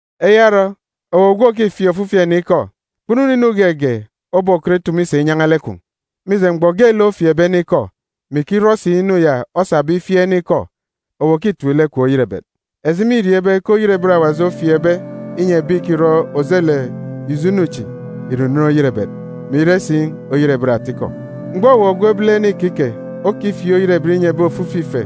Eya orọ, owu ogwu òkifieek ofifi ene ikọ, kpunu inu geege obokọt itumu isa inyan̄a lek kwun̄. Mije, mgbọ geelek ofieekbe ene ikọ, mè ikirọ si inu ya osabe ifieek ene ikọ, owu òkitip lek kwun̄ oyerebet. Eji mîriọọn̄ ibe ke oyerebet Awaji ofieekbe inyi ebi ìkirọ ojelek ijo inu chi ìre unen oyerebet, mè ire si oyerebet atikọ. Mgbọ owu ogwu ebilene ikike okifieek oyerebet inyi ebi ofifi ife,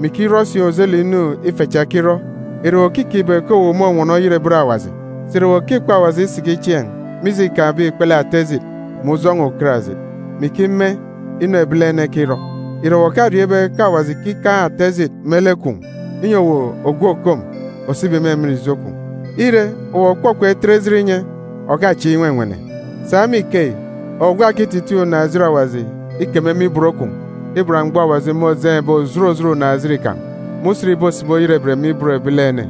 mè ikirọ si ojelek ijo inu ife cha ekirọ, ìre owu òkikeek ibe ke owu mônwọnọ oyerebet Awaji? Sà ìre owu òkikpọ Awaji isiki chieen̄, mije îkaan̄be ikpele ata ejit, mè ujọn̄ọ ukarajit, mè ikime inu ebilene ekirọ? Ìre owu òkariọọn̄ ibe ke Awaji ìkikaan̄ ata ejit me lek kwun̄, inyi owu ògwu òkom òsibi me emen ijo kwun̄? Ire, owu òkpọkpọ itet ejit inye, òkachieek inwenwene. Sa me ikeyi, owu gwa òkititiin̄ unaan̄-ejit Awaji ikeme me ibot kwun̄ iban mgbọ Awaji môjeen̄be òjot òjot unaan̄-ejit kan̄, me usen ìbosibi oyerebet me ibot ebilene.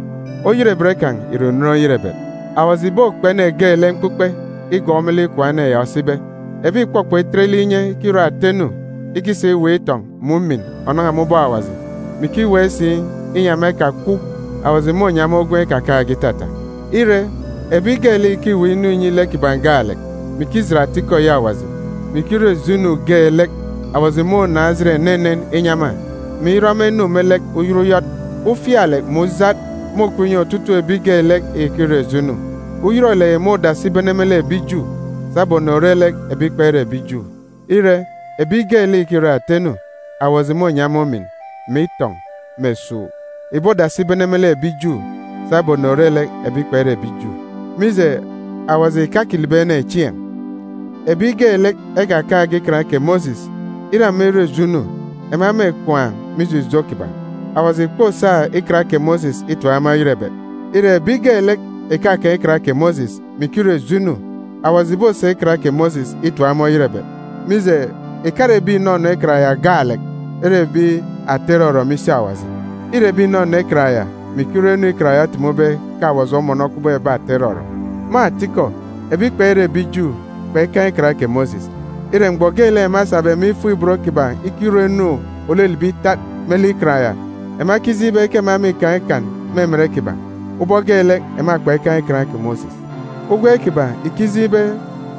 Oyerebet kan̄ ìre unen oyerebet. Awaji ìbokpe ene geelek mkpukpe igọọk me lek ikwaan̄ ene ya osibe.a Ebi ìkpọkpọ itet lek inye ikirọ ata inu ikisa iweek itọn̄ mè umin ònan̄a me ubọk Awaji, mè ikiweek si inyi ema ekakwaan̄, Awaji mônyi ema ugwem ikakaan̄ge itata. Ire, ebi geelek ìkiweek inu inyi lek kiban̄ gaalek, mè ikijit atikọ eyi Awaji, mè ikirọ ijo inu geelek, Awaji mônaan̄ ejit enenen inyi ema, mè irọ ema inu me lek uyọt uyọt. Ufialek mè ujat môkup inyi otutuuk ebi geelek ìkirọ ijo inu. Uyọrọlek yi môdasi ibene me lek ebi Ju, sabum ònore lek ebi kpere ebi Ju. Ire, ebi geelek ìkirọ ata inu, Awaji mônyi ema umin, mè itọn̄, mè esuuk. Ìbodasi ibene me lek ebi Ju, sabum ònore lek ebi kpere ebi Ju. Mije, Awaji ìkakilibi ene chieen̄. Ebi geelek ekakaan̄ge Ikan kè Mosis, ire ema irọ ijo inu, ema mêkwaan̄ mije ijo kiban̄. Awaji ìkposa Ikan kè Mosis itip ema oyerebet. Ire, ebi geelek ìkakaan̄ Ikan kè Mosis, mè ikirọ ijo inu, Awaji ìbosa Ikan kè Mosis itip ema oyerebet. Mije, ìkare ebi ìnọnọ Ikan ya gaalek ere ebi ata irọrọ me isi Awaji. Îre ebi ìnọnọ Ikan ya, mè ikirọ inu Ikan ya otumube ke Awaji omọnọ kubọk ebi ata irọrọ. (Me atikọ, ebi kpere ebi Ju kpekaan̄ Ikan kè Mosis. Ire, mgbọ geelek ema esabe me ifuk-ibot kiban̄ ikirọ inu òlilibi itat me lek Ikan ya, ema ekijeen̄ ibe ke ema mîkaan̄ ikan me emen kiban̄, ubọk geelek ema kpekaan̄ Ikan kè Mosis. Ugwem kiban̄ ìkijeen̄ ibe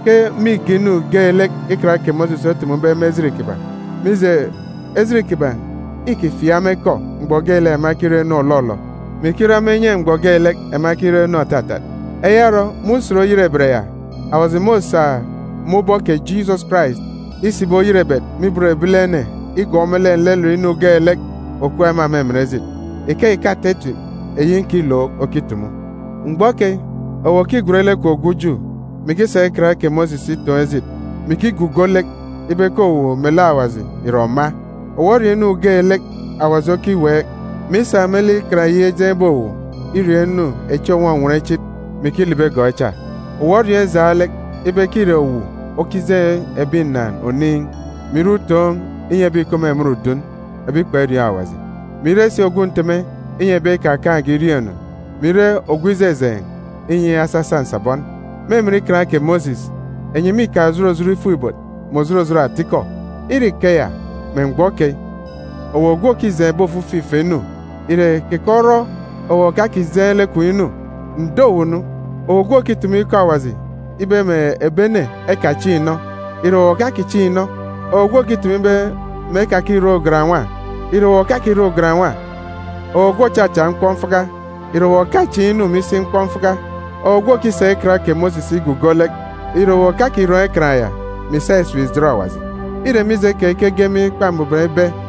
ke mîge inu geelek Ikan kè Mosis otumube me ejit kiban̄. Mije, ejit kiban̄ îkifieek ema ikọ mgbọ geelek ema ekirọ inu òlọlọ, mè ikirọ ema inye mgbọ geelek ema ekirọ inu òtatat.) Eya orọ, me Usen Oyerebet ya, Awaji môsa me ubọk kè Jisọs Karais isibi oyerebet me ibot ebilene igọọk me lek nlelet inu geelek òkup ema me emen ejit. Ikeyi ke ata etip eyi nkilook okitumu. Mgbọ keyi, owu òkigwen lek kwun̄ ogwu Ju, mè ikisa Ikan kè Mosis itoon̄ ejit, mè ikigugo lek ibe ke owu melek Awaji ìre òma; owu oriọọn̄ inu geelek Awaji okiweek, mè isa me lek Ikan eyi ejeen̄be owu iriọọn̄ inu echi ònwọnwọn ichit, mè ikilibi igọọk echa; owu oriọọn̄ ijaan̄ lek ibe ke îre owu okijeen̄ ebi ǹnàan̄ oniin̄, mè ire utoon̄ inyi ebi ìkup me emen udun, ebi kperiọọn̄ Awaji, mè ire si ogwu nteme inyi ebi ekakaan̄ge iriọọn̄-inu, mè ire ogwu ijejeen̄ inyi asasa nsabọn. Me emen Ikan kè Mosis, enyi mîkaan̄ òjot òjot ifuk-ibot, mè òjot òjot atikọ. Ire ikeya, me mgbọ keyi, owu ogwu òkijeen̄ ebi ofifi ife inu, ìre keke orọ owu òkakijeen̄ lek kwun̄ inu? Ǹdo owu nu! Owu ogwu òkitumu ikọ Awaji ibe mè ebi ene ekachiin̄ inọ, ìre owu òkakichiin̄ inọ? Owu ogwu òkitumu ibe mè ekakirọ ugan-nwa, ìre owu òkakirọ ugan-nwa? Owu ogwu òchacha mkpọmfaka, ìre owu òkachiin̄ inu me isi mkpọmfaka? Owu ogwu òkisa Ikan kè Mosis igugo lek, ìre owu òkakirọn̄ Ikan ya, mè ìsa esip ìjet Awaji? Îre mije keyi ke ege me emen Ikpa Mbuban ibe,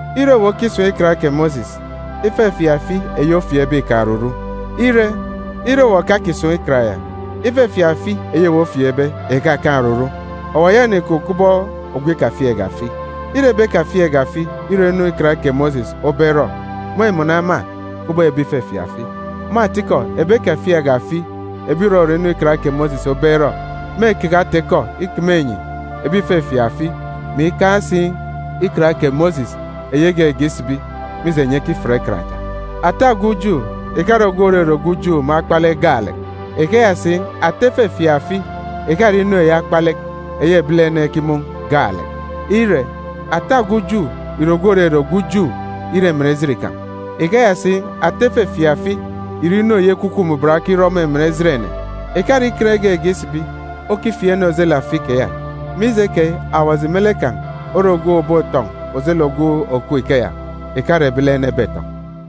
Ire owu okisun̄ Ikan kè Mosis, ifefieek afi eyi ofieekbe îkaan̄ oruru. Ire, ire owu òkakisun̄ Ikan ya, ifefieek afi eyi owu ofieekbe ìkakaan̄ oruru, owu òyaka inikup kubọk ogwu ikafieekge afi. Ire ebi ekafieekge afi irọ inu Ikan kè Mosis obe erọ, mêmọnọ ema kubọk ebi ìfefieek afi. Me atikọ, ebi ekafieekge afi ebi ìrọrọ inu Ikan kè Mosis obe erọ, mêkeke ata-ikọ ikeme enyi ebi ìfefieek afi, mè ikaan̄ si Ikan kè Mosis eyi egege isibi, mije enyi ekifiat Ikan cha. Ata ogwu Ju ìkare ogwu òrere ogwu Ju me akpalek gaalek. Ikeya si, ata ifefieek afi ìkare inu eyi akpalek, eyi ebilene ekimun̄ gaalek. Ire, ata ogwu Ju ìre ogwu òrere ogwu Ju ire emen ejit kan̄. Ikeya si, ata ifefieek afi ìre inu eyi Ekwukwu Mbuban okirọ me emen ejit ene. Ìkare Ikan egege isibi okifieek ene ojelek afi keya. Mije keyi, Awaji me lek kan̄ ore ogwu òbotọn̄ ojelek ogwu òkup ikeya, ìkare ebilene ebetọn̄.